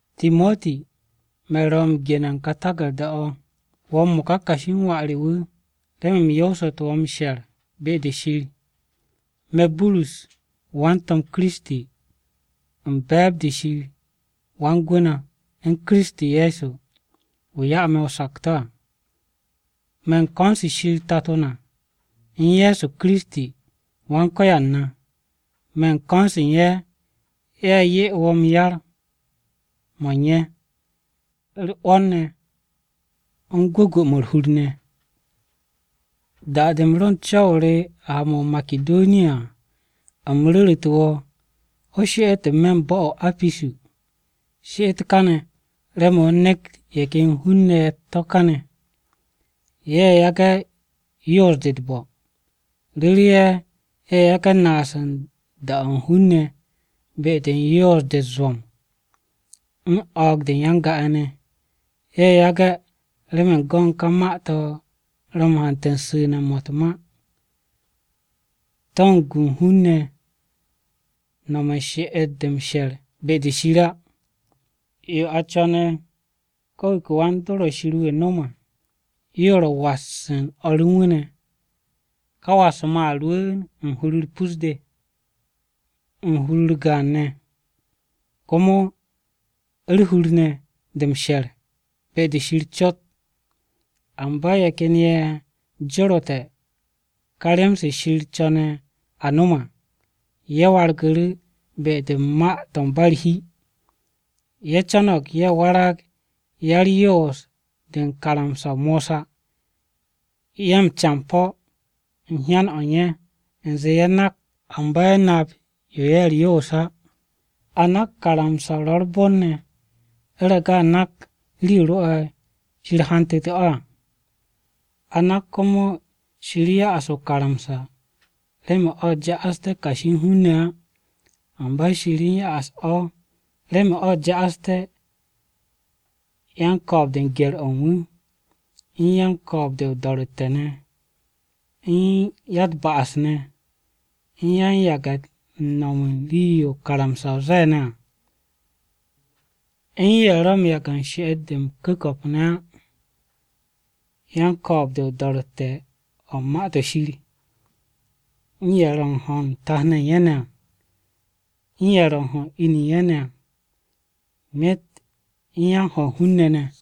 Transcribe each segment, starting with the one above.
Timoti, Burus ro̱ wo̱ m-gene̱ u̱n ka taku̱rda-o̱. Wo̱ m-mo̱ka kashi u̱n wà re wu̱, remen u̱m yoosu̱tu̱ wo̱ m-she̱r be-de Shir. Me̱, Burus, wan-To̱m Ye̱so Kiristi, u̱n be̱e̱b-de Shir, Wan-Gwu̱ na u̱n Kiristi Ye̱so, wu̱ ya'u̱ na o-sakto̱ à. Me̱ u̱n ko̱n-se Shir Tato na, u̱n Ye̱so Kiristi, Wan-Ko̱yan na. Me̱ u̱n ko̱n-se ye̱ 'ye wo̱ yar-mo̱ u̱n ye̱, u̱r-'wo̱n ne̱, u̱n gwu̱gwu̱-mo̱ u̱r-hur ne̱. Da-de u̱m ro u̱n co̱w-o re ha-mo̱ o-Makidoniya à, u̱m ru̱ru̱te̱ wo̱ o she'et n-me̱ bo̱-o̱ o-Apisu. She'et kane̱ remen o nekt ye̱ ken hun-ne̱ ye̱ u̱t-to̱ kane̱, ye̱ yage̱ yoos-de u̱t-bo̱. Ru̱re̱ ye̱, ye̱ yage̱ naas u̱n da-o̱ hun-ne̱ be-de u̱n yoos-de u̱t-zwo̱m, u̱n o̱o̱g-de u̱n ya-n-ga-ye̱ ne̱. Ye̱ yage̱ remen go̱n ka ma-to̱ ro̱ m-hante̱ su̱nu̱-mo̱ u̱t-ma. To̱ u̱n gu u̱n hun-ne̱ no̱m u̱n she'et-de m-she̱r be-de Shir á. Yo a co̱ne̱ ko̱ wu̱ ke wan-dor o̱ Shir wu̱ nom à, yo ro̱ m-was u̱n o̱r u̱n wu̱ ne̱ ne̱. Ka was-mo̱ a rwu̱u̱n u̱n hur-u̱r pus-de, u̱n hur-u̱r gaan ne̱, komo u̱r-hur ne̱ de m-she̱r be-de Shir cot. Amba ye̱ ken ye̱ joru̱te̱ ka rem-se Shir co̱ne̱ a no̱m à, ye̱ wargu̱ru̱ be-de u̱n ma-to̱ ba u̱r-hi. Ye̱ co̱no̱g ye̱ warag ya-u̱r-yoos-de u̱n karamsa-o Mosa. Ye̱ m-campo̱ u̱n hyan-o̱ u̱n ye̱, u̱nze ye̱ nak. Amba ye̱ nap yo ye̱ u̱r-yoos á. A nak karamsa-o ro̱ u̱r-bon ne̱, u̱rege̱ a nak rii-yo rwo̱'e̱ Shir hantu̱te̱ o̱ à. A nak komo, Shir ya'as o-karamsa remen o̱ ja'asté̱ kashi u̱n hun-ne̱ á. Amba Shir u̱n ya'as o̱ remen o̱ ja'asté̱: Yan-ko̱o̱b-de u̱n gye̱r-o̱ u̱n wu̱, U̱n yan-ko̱o̱b-de o-do̱ro̱tte̱ ne̱, U̱n ya-u̱t-ba'as ne̱, U̱n yan-yage̱ u̱n nom u̱n rii-yo karamsa-o ze̱e̱ ne̱ à, U̱n ye̱ ro̱ m-yage̱ she'et-de m-ku̱ko̱p ne̱ á, Yan-ko̱o̱b-de o-do̱ro̱tte̱ o̱ u̱n Ma-to̱ Shir, U̱n ye̱ ro̱ u̱n ho̱ u̱n tat-ne̱ ye̱ u̱n ye̱ ne̱ à, U̱n ye̱ ro̱ u̱n ho̱ u̱n in-ne̱ ye̱ u̱n ye̱ ne̱ à, Myet u̱n yan-ho̱ u̱n hun-ne̱ ne̱,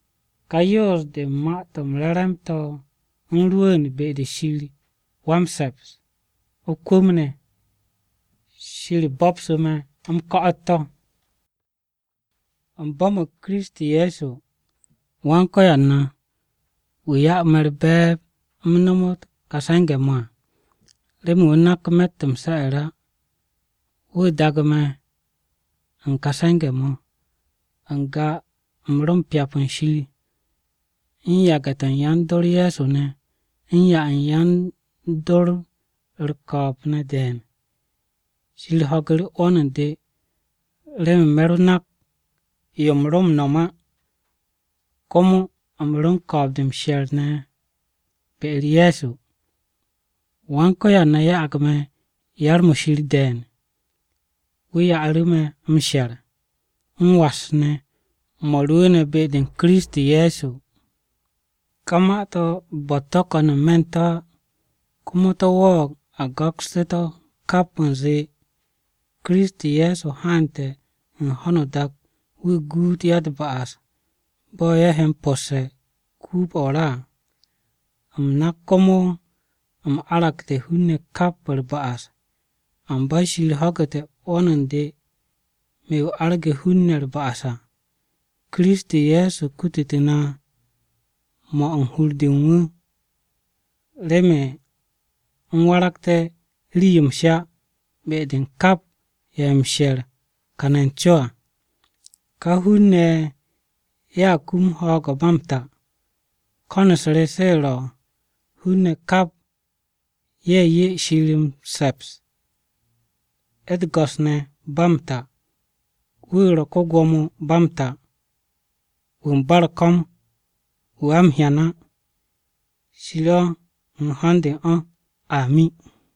Ka yoos-de u̱n Ma-to̱ m-Re̱re̱m to̱ u̱n rwu̱u̱n be-de Shir wa-m-se̱ps, o-kwu̱m ne̱. Shir bo̱bsu̱ me̱ m-ko̱'o̱t to̱. U̱m bo̱mo̱g Kiristi Ye̱so, Wan-Ko̱yan na, wu̱ ya'u̱ me̱ u̱r-be̱e̱b u̱m nomot ka se̱nge̱-mo̱ à, remen wu̱ nak me̱tt m-se̱'e̱r á. Wu̱ daagu̱ me̱ u̱n kà se̱nge̱-mo̱. N-ga u̱m ro m-pyap u̱n Shir, u̱n yage̱-to̱ u̱n yan-dor Ye̱so ne̱, u̱n 'ya u̱n yan-dor u̱r-ko̱o̱b ne̱ de̱e̱n. Shir ho̱gu̱ru̱ 'wo̱n u̱n de remen me̱ ro nak yo u̱m ro m-nom á, komo u̱m ro u̱n ko̱o̱b-de m-she̱r ne̱ be-u̱r Ye̱so. Wan-Ko̱yan na ya'ag me̱ yar-mo̱ Shir de̱e̱n. Wu̱ ya'u̱ru̱ me̱ m-she̱r, m-was ne̱, mo̱ rwu̱u̱ne̱ be-u̱r Kiristi Ye̱so à. Ka ma-to̱, bo̱-u̱t to̱ ko̱n n-me̱ u̱n to̱ á, komo to̱ wo̱o̱g a go̱kste̱ to̱ kap u̱nze, “Kiristi Ye̱so haante̱ u̱n ho̱no o-dak wu̱ guut ya-u̱t-ba'as, bo̱ ye̱ he m-po̱sse̱ den-o̱ o-ra à.” U̱m nak komo u̱m aragte̱ hun-ne̱ kap u̱r-ba'as. Amba Shir ho̱gu̱te̱ 'wo̱n u̱n de, me̱ wu̱ arge̱ hun-ne̱ u̱r-ba'as à. Kiristi Ye̱so kututu̱ na mo̱ u̱n hur-de u̱n wu̱ remen u̱m waragté̱ rii-yo m-sha be-de u̱n kap ye̱ he m-she̱r kane̱ n-co à. Ka hun-ne̱ ye̱a kum ho̱o̱g-o̱ ba m-ta. Ko̱n-u̱s re se ro̱ hun-ne̱ kap ye̱ 'ye Shir m-se̱ps, u̱t-go̱s ne̱, ba m-ta. Wu̱ ro̱ ko-Gwo̱mo ba m-ta. Wu̱ u̱n ba u̱r-ko̱m. Wu̱ a m-hyan á. Shir o̱ u̱n ho̱n-de u̱n o̱. Amin.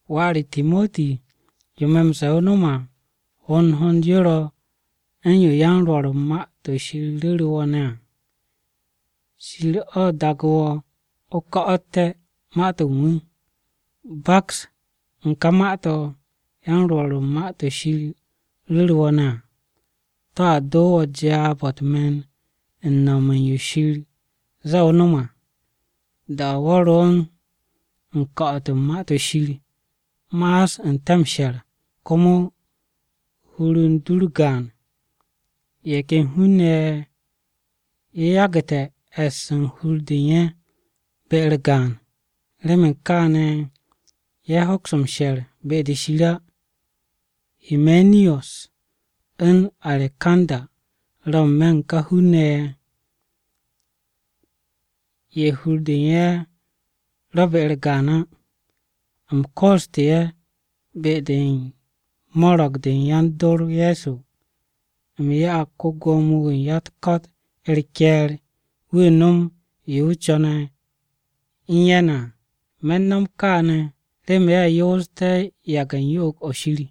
Wà re Timoti, yo me̱ m-ze̱e̱ o no̱m à, hond hond yo ro̱ u̱n yo yan-rwo̱r u̱n Ma-to̱ Shir ru̱ru̱ wo̱ ne̱ à. Shir o̱ daagu̱ wo̱ o ko̱'o̱te̱ ma-to̱ u̱n wu̱. Baks u̱n kà ma-to̱ yan-rwo̱r u̱n Ma-to̱ Shir ru̱ru̱ wo̱ ne̱ à, to̱a do wo̱ jaab-o̱ u̱t-me̱n u̱n no̱m u̱n yo Shir ze̱e̱ o no̱m à. Da-o̱ wo̱ ro u̱n ko̱'o̱t u̱n Ma-to̱ Shir, ma'as n-te̱ m-she̱r, komo hur u̱n du kaps wo̱ á. Ye̱ ken hun-ne̱ ye̱ hur-de u̱n ye̱ kapste̱ ye̱. Remen kaane̱ ye̱ hoks m-she̱r be-de Shir á. Himeniyus u̱n Arekanda ro̱ n-me̱ u̱n ka hun-ne̱ ye̱, ye̱ hur-de u̱n ye̱ ro̱ be-u̱r gaan á. U̱m koostu̱ ye̱ be-de u̱n mo̱ro̱g-de u̱n yan-dor Ye̱so. U̱m ya'ag ko-Gwo̱mo-wu̱ u̱n ya-u̱t-ko̱t u̱r-ke̱e̱r wu̱ nom yo wu̱ co̱ne̱ u̱n ye̱ ne̱ à. Me̱ u̱n no̱m kaane̱ remen ye̱ yoosté̱ yage̱ u̱n yo'og-o̱ Shir.